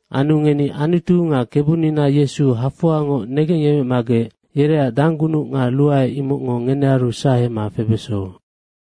Anu ngeni Anutu nga Kebunina Yesu hafoangoc negengyemecmagec yereac danggunuc nga ruae, imocngo ngenearu sahema febeso.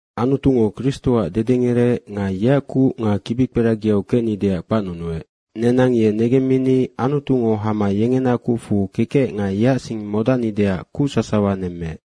Anutungo Kristoac dedengerec nga yeac kuc nga kibikperagiau kecnideac kpacnunuec. Nenang ye negemmini Anutungo hama yengena kucfu kekec nga yeac sing modacnideac kuc sasawa nemmeec.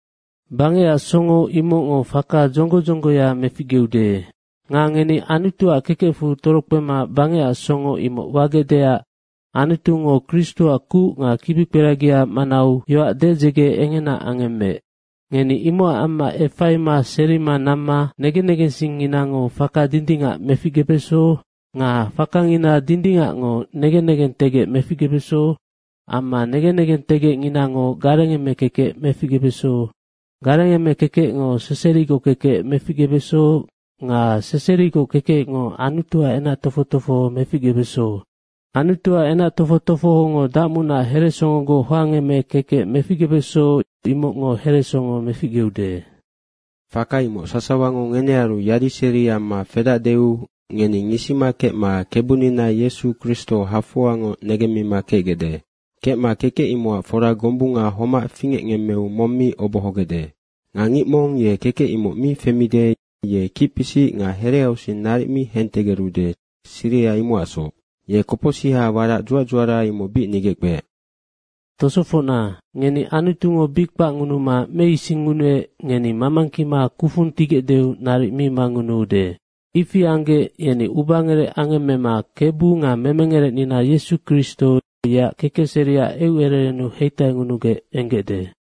Bangecac songo imocngo faka dzonggo dzonggoya meficgeude. Nga ngeni Anutuac kekecfu torokpema bangecac songo imoc wagecdeac Anutungo Kristoac kuc nga kibikperagia manau yoac dedzege engena angemmeec. Ngeni imocac amma efaima serima namma negen negensingnginango faka dindingac meficgebeso nga fakangina dindingacngo negen negentegec meficgebeso amma negen negentegecnginango garengeme kekec meficgebeso, garengeme kekecngo seserigoc kekec meficgebeso nga seserigoc kekecngo Anutuac enac tofoc tofoho meficgebeso, Anutuac enac tofoc tofohongo dacmunac heresongogoc hoangeme kekec meficgebeso imocngo heresongo meficgeude. Faka imoc sasawango ngenearu yadiseri amma fedacdeu ngeni ngisima kecma Kebunina Yesu Kristo hafoangoc negemmima kecgecde. Kecma kekec imocac fora gombunga homac fingecngemmeu mong mi obohogecde. Nga ngic mong ye kekec imoc mi femide, ye kicpisic nga hereausing naric mi hentegerude, siriha imocacsoc. Ye kopocsiha warac dzuac dzuara, imoc bic nigeckpeec. Tosofocna, ngeni Anutungo bic kpacngunuma meisingngunuec, ngeni mamangkima kufung tigecdeu naric mi mangunuude. Ifi anggec yeni ubangerec angemmema Kebu nga memengerecnina Yesu Kristo yeac kekecseriac eucererennu heitaingunugec enggecde.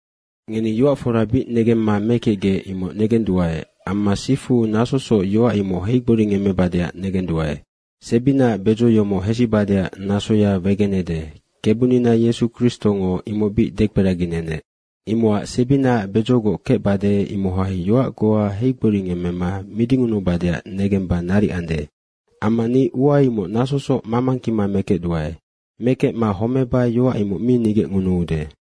Ngeni yoac fora bic negemma mekecgec imoc negenduae, amma sifu nasosoc yoac imoc heigboringemmebadeac negenduae. Amma sebinaac bedzo yomoc hesibadeac nasoya wegenede, Kebunina Yesu Kristongo imoc bic dekperaginenec. Imocac sebinaac bedzogoc kecbade, imohai yoac goa heigboringemmema midingunubadeac negemba naric ande. Amma ni ua imoc nasosoc mamangkima mekecduae. Mekecma homeba, yoac imoc mi nigecngunuude.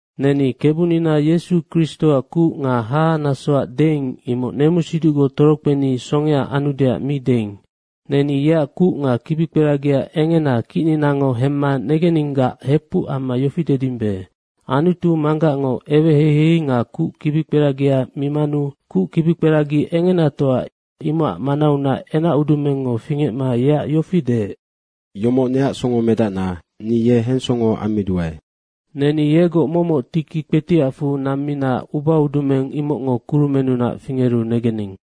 Neni Kebunina Yesu Kristoac kuc nga hahanasoac deing, imoc nemusiducgoc torokpeni songea anudeac mi deing. Neni yeac kuc nga kibikperagia engena kicninango hemma negeninggac hepuc amma yofi dedimbe, Anutu Manggacngo eweheihei nga kuc kibikperagia mimanu kuc kibikperagi engenatoa imocac manaunac enacudumengngo fingecma yeac yofi deec, “Yomoc neac Songomedacna, ni ye hensongo ammiduae.” Neni yegoc momoc tiki kpetiacfu nammina ubaudumeng imocngo kurumennunac fingeru negening.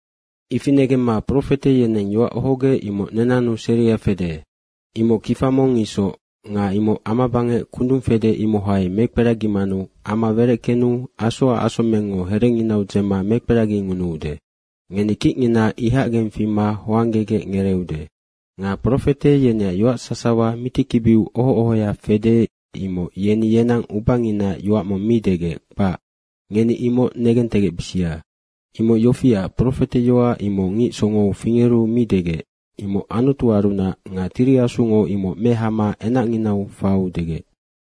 Ifi negemma, profete yeneng yoac ohogec, imoc nenannu seria fede. Imoc kifa mong isoc nga imoc amabangec kundung fede, imohai mekperagimanu ama wereckenu asoac asomengngo herenginau dzema mekperagingunuude, ngeni kicngina ihacgeng fima hoanggegec ngereeude. Nga profete yeneac yoac sasawa mitikibiu oho ohoya fede, imoc yeni yenang ubanginaac yoac mong mi degec, kpac. Ngeni imoc negentegecbisia. Imoc yofiac, profeteyoac imoc ngic songou fingeru mi degec, imoc Anutuarunac nga Tiri Asungo imoc mehama enacnginau faiu degec.